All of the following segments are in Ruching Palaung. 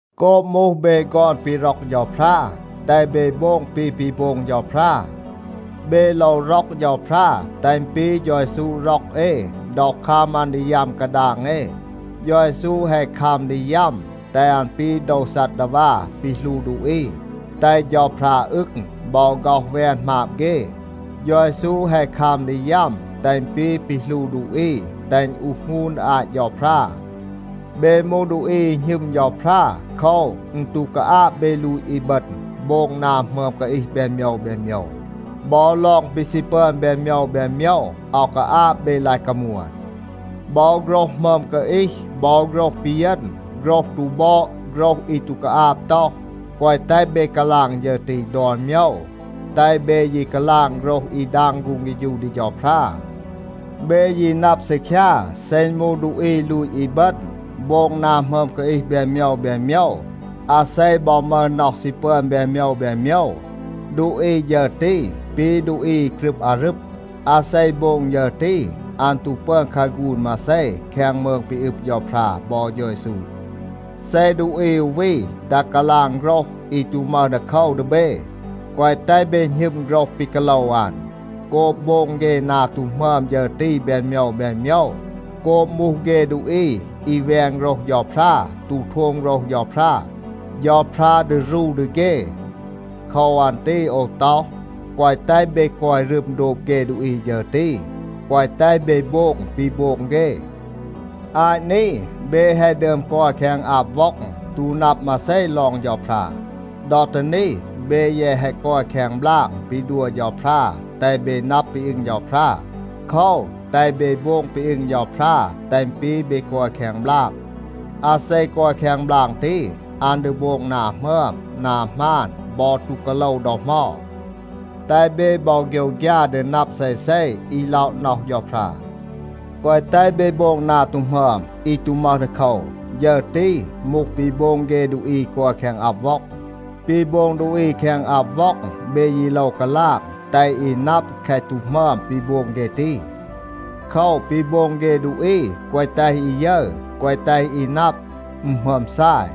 โกบ มูห เบ ฆอน ปี ร็อก เฌาพรา, แตห เบ โบง ปี ปี โบง เฌาพรา. เบ โลว ร็อก เฌาพรา, แตห อึณ ปี เฌา เยซู ร็อก เอ ดอ คัม อัน ดี ยัม กาดาง เอ. เฌา เยซู แฮะ คัม ดี ยัม, แตห อัน ปี โดว ซัดดาวา ปี หลู ดูอี, แตห เฌาพรา อึง บอ ฆ็อห แวน หมาบ เฆ. เฌา เยซู แฮะ คัม ดี ยัม, แตห อึณ ปี ปี หลู ดูอี, แตห อึณ อูห หงูน ดี อาต เฌาพรา. เบ มูห ดูอี อี หณึม เฌาพรา. โคว, อึณ ตู กาอาบ เบ ลูต อีบึณ, โบง นา หมึอม กาอีห แบน โมยว แบน โมยว. บอ ลอง ปี ซี ปึอน แบน โมยว แบน โมยว, อาว กาอาบ เบ ลาย กามวน. บอ โฆรห หมึอม กาอีห บอ โฆรห ปีเยณ, โฆรห ตู บอด, โฆรห อี ตู กาอาบ ต็อห, แกวะ แตห เบ กาลาง ฌึร ตี ดอน โมยว. แตห เบ ยี กาลาง โฆรห อี ดาง ฆูง เฆฌู ดี เฌาพรา. เบ ยี นับ ซีคยา, เซ อึณ มูห ดูอี ลูต อีบึณ, โบง นา หมึอม กาอีห แบน โมยว แบน โมยว, อาเซ บอ มึห น็อห ซี ปึอน แบน โมยว แบน โมยว, ดูอี ฌึร ตี ปี ดูอี อี กรึบ อารึบ. อาเซ โบง ฌึร ตี, อัน ตู ปึอน คาฆูน มาเซ แคง มืง ปี อึบ เฌาพรา บอ เฌา เยซู. เซ ดูอี อู วี ตัห กาลาง โฆรห อี ตู มึห ดีโคว ดี เบ, แกวะ แตห เบ หณึม โฆรห ปี กาโลว อัน. โกบ โบง เฆ นา ตู หมึอม ฌึร ตี แบน โมยว แบน โมยว, โกบ มูห เฆ ดูอี อี แวน โฆรห เฌาพรา, ตู โทม โฆรห เฌาพรา, เฌาพรา ดี รู ดี เฆ. โคว อัน ตี โอว ต็อห, แกวะ แตห เบ กอย รึม โดบ เฆ ดูอี ฌึร ตี, แกวะ แตห เบ โบง ปี โบง เฆ. อาต นี เบ แฮะ ดึอม กอย แคง อับ ว็อง, ตู นับ มาเซ ลอง เฌาพรา. ดอ ตี นี เบ แยะ แฮะ กอย แคง บลาง ปี ดัว เฌาพรา, แตห เบ นับ ปี อึง เฌาพรา. โคว, แตห เบ โบง ปี อึง เฌาพรา, แตห อึณ ปี เบ กอย แคง บลาง. อาเซ กอย แคง บลาง ตี, อัน ดี โบง นา หมึอม, นา หมาน บอ ตู กาโลว ดอ เหมา. แตห เบ บอ โฆยวฆยา ดี นับ เซเซ อี ล็อะ น็อห เฌาพรา. แกวะ แตห เบ โบง นา ตู หมึอม อี ตู มึห ดีโคว. ฌึร ตี มูห ปี โบง เฆ ดูอี อี กอย แคง อับ ว็อง. ปี โบง ดูอี แคง อับ ว็อง เบ ยี โลว กาลาง, แตห อี นับ แคะ ตู หมึอม ปี โบง เฆ ตี. โคว, ปี โบง เฆ ดูอี แกวะ แตห อี ยึร, แกวะ แตห อี นับ, อึณ หมึอม ซาย.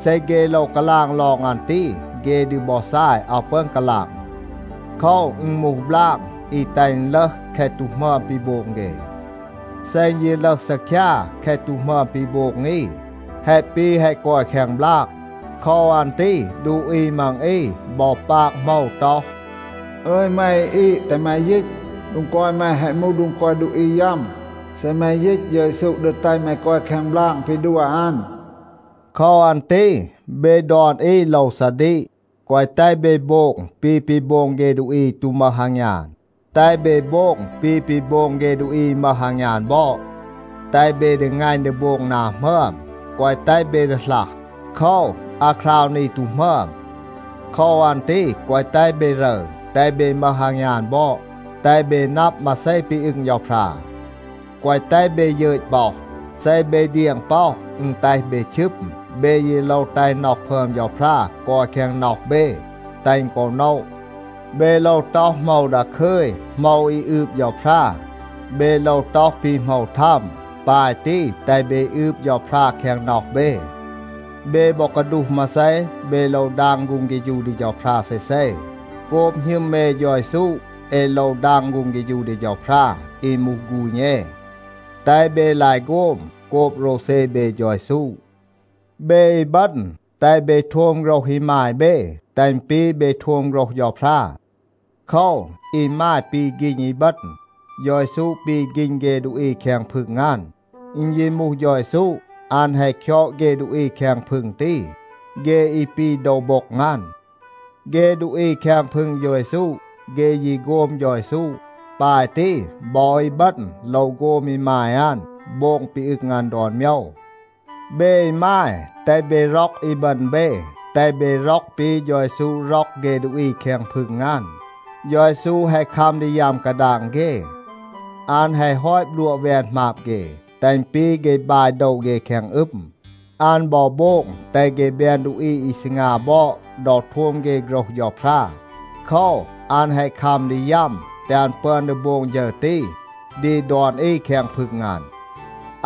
เซ เฆ โลว กาลาง ลอง อัน ตี, เฆ ดี บอ ซาย, อาว ปึอน กาลาง. โคว, อึณ มูห บลาง อี แตห อึณ ลึห แคะ ตู หมึอม ปี โบง เฆ. เซ อึณ ยี ลึห ซีคยา แคะ ตู หมึอม ปี โบง อี, แฮะ ปี แฮะ กอย แคง บลาง. โคว อัน ตี ดูอี มัง อี บอ ปาก โหมว ต็อห, “อึย แม อี อีด, แตห แม ยีต. โดง กอย แม แฮะ มูห โดง กอย ดูอี ยัม. เซ แม ยีต, เฌา เยซู ดี แตห แม กอย แคง บลาง ปี ดัว อัน.” โคว อัน ตี เบ ดอน อี โลว ซาดีก, แกวะ แตห เบ โบง ปี ปี โบง เฆ ดูอี อี ตู มึห อางยาน, แตห เบ โบง ปี ปี โบง เฆ ดูอี อี มึห อางยาน บอด. แตห เบ ดีงัณ ดี โบง นา หมึอม, แกวะ แตห เบ ดีหลัห. โคว, อาคราว นี ตู หมึอม. โคว อัน ตี แกวะ แตห เบ รึร, แตห เบ มึห อางยาน บอด, แตห เบ นับ มาเซ ปี อึง เฌาพรา. แกวะ แตห เบ ยึต ป็อห. เซ เบ เดียง ป็อห, อึณ แตห เบ ชึม. เบ ยี โลว แตห น็อห พึอม เฌาพรา กอย แคง น็อห เบ, แตห อึณ กอ โนะ. เบ โลว ต็อห โหมว ดาคึย, โหมว อี อืบ เฌาพรา. เบ โลว ต็อห ปี โหมว ทัม. ปาย ตี แตห เบ อืบ เฌาพรา แคง น็อห เบ. เบ บอ กาดูห มาเซ, เบ โลว ดาง ฆูง เฆฌู ดี เฌาพรา เซเซ. โกบ หณึม เอ เฌา เยซู เอ โลว ดาง ฆูง เฆฌู ดี เฌาพรา, อี มูห ฆูณ เอ. แตห เบ ลาย โฆม โกบ โรวเซ เบ เฌา เยซู. เบ อีบึณ, แตห เบ โทม โฆรห อีมาย เบ, แตห อึณ ปี เบ โทม โฆรห เฌาพรา. โคว, อีมาย ปี ฆีณ อีบึณ. เฌา เยซู ปี ฆีณ เฆ ดูอี แคง พึง อัน. อึณ ยี มูห เฌา เยซู, อัน แฮะ คยอด เฆ ดูอี แคง พึง ตี, เฆ อี ปี โดว โบ็ง อัน. เฆ ดูอี แคง พึง เฌา เยซู, เฆ ยี โฆม เฌา เยซู. ปาย ตี บอ อีบึณ โลว โฆม อีมาย อัน, โบง ปี อึง อัน ดอน โมยว. เบ อีมาย, แตห เบ ร็อก อีบึณ เบ, แตห เบ ร็อก ปี เฌา เยซู ร็อก เฆ ดูอี แคง พึง อัน. เฌา เยซู แฮะ คัม ดี ยัม กาดาง เฆ. อัน แฮะ ฮอต บลัวะ แวน หมาบ เฆ, แตห อึณ ปี เฆ บาย โดว เฆ แคง อึม. อัน บอ โบง แตห เฆ แบน ดูอี อี ซีงา บอด ดอ โทม เฆ โฆรห เฌาพรา. โคว, อัน แฮะ คัม ดี ยัม, แตห อัน ปึอน ดี โบง ฌึร ตี ดี ดอน อี แคง พึง อัน.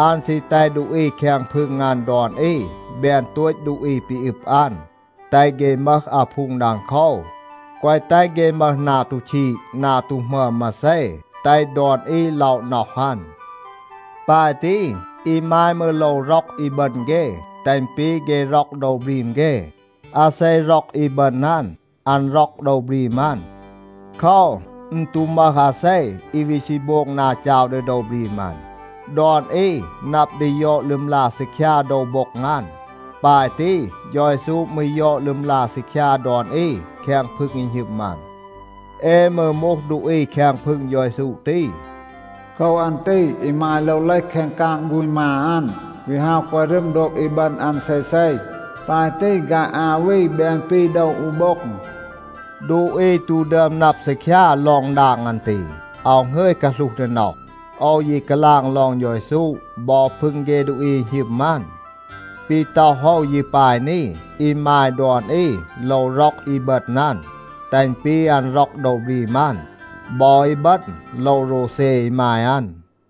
อัน ซี แตห ดูอี แคง พึง อัน ดอน อี แบน โตต ดูอี ปี อึบ อัน, แตห เฆ มึห อาพูง ดังโคว, แกวะ แตห เฆ มึห นา ตู ชีด, นา ตู หมึอม มาเซ, แตห ดอน อี ล็อะ น็อห อัน. ปาย ตี อีมาย มืร โลว ร็อก อีบึณ เฆ, แตห อึณ ปี เฆ ร็อก โดว บรีม เฆ. อาเซ ร็อก อีบึณ อัน, อัน ร็อก โดว บรีม อัน. โคว, อึณ ตู มึห อาเซ อี วี ซี โบง นา จาว ดี โดว บรีม อัน. ดอน อี นับ ดี ยอด ลึมลา ซีคยา โดว โบ็ง อัน. ปาย ตี เฌา เยซู มืร ยอด ลึมลา ซีคยา ดอน อี แคง พึง อี หณึม อัน. เอ มืร มูห ดูอี แคง พึง เฌา เยซู ตี. โคว อัน ตี อีมาย โลว เลห แคง กาง ฆูณ มา อัน, วี ฮาว กอย รึม โดบ อีบึณ อัน เซเซ. ปาย ตี ฆาย อา วี แบน ปี โดว อู โบ็ง. ดูอี ตู ดึอม นับ ซีคยา ลอง ดาง อัน ตี. อาว หงึย กาหลูห ดี น็อห. โอว ยี กาลาง ลอง เฌา เยซู บอ พึง เฆ ดูอี อี หณึม อัน. ปี ต็อห โอว ยี ปาย นี. อีมาย ดอน อี โลว ร็อก อีบึณ อัน, แตห อึณ ปี อัน ร็อก โดว บรีม อัน. บอ อีบึณ โลว โรวเซ อีมาย อัน.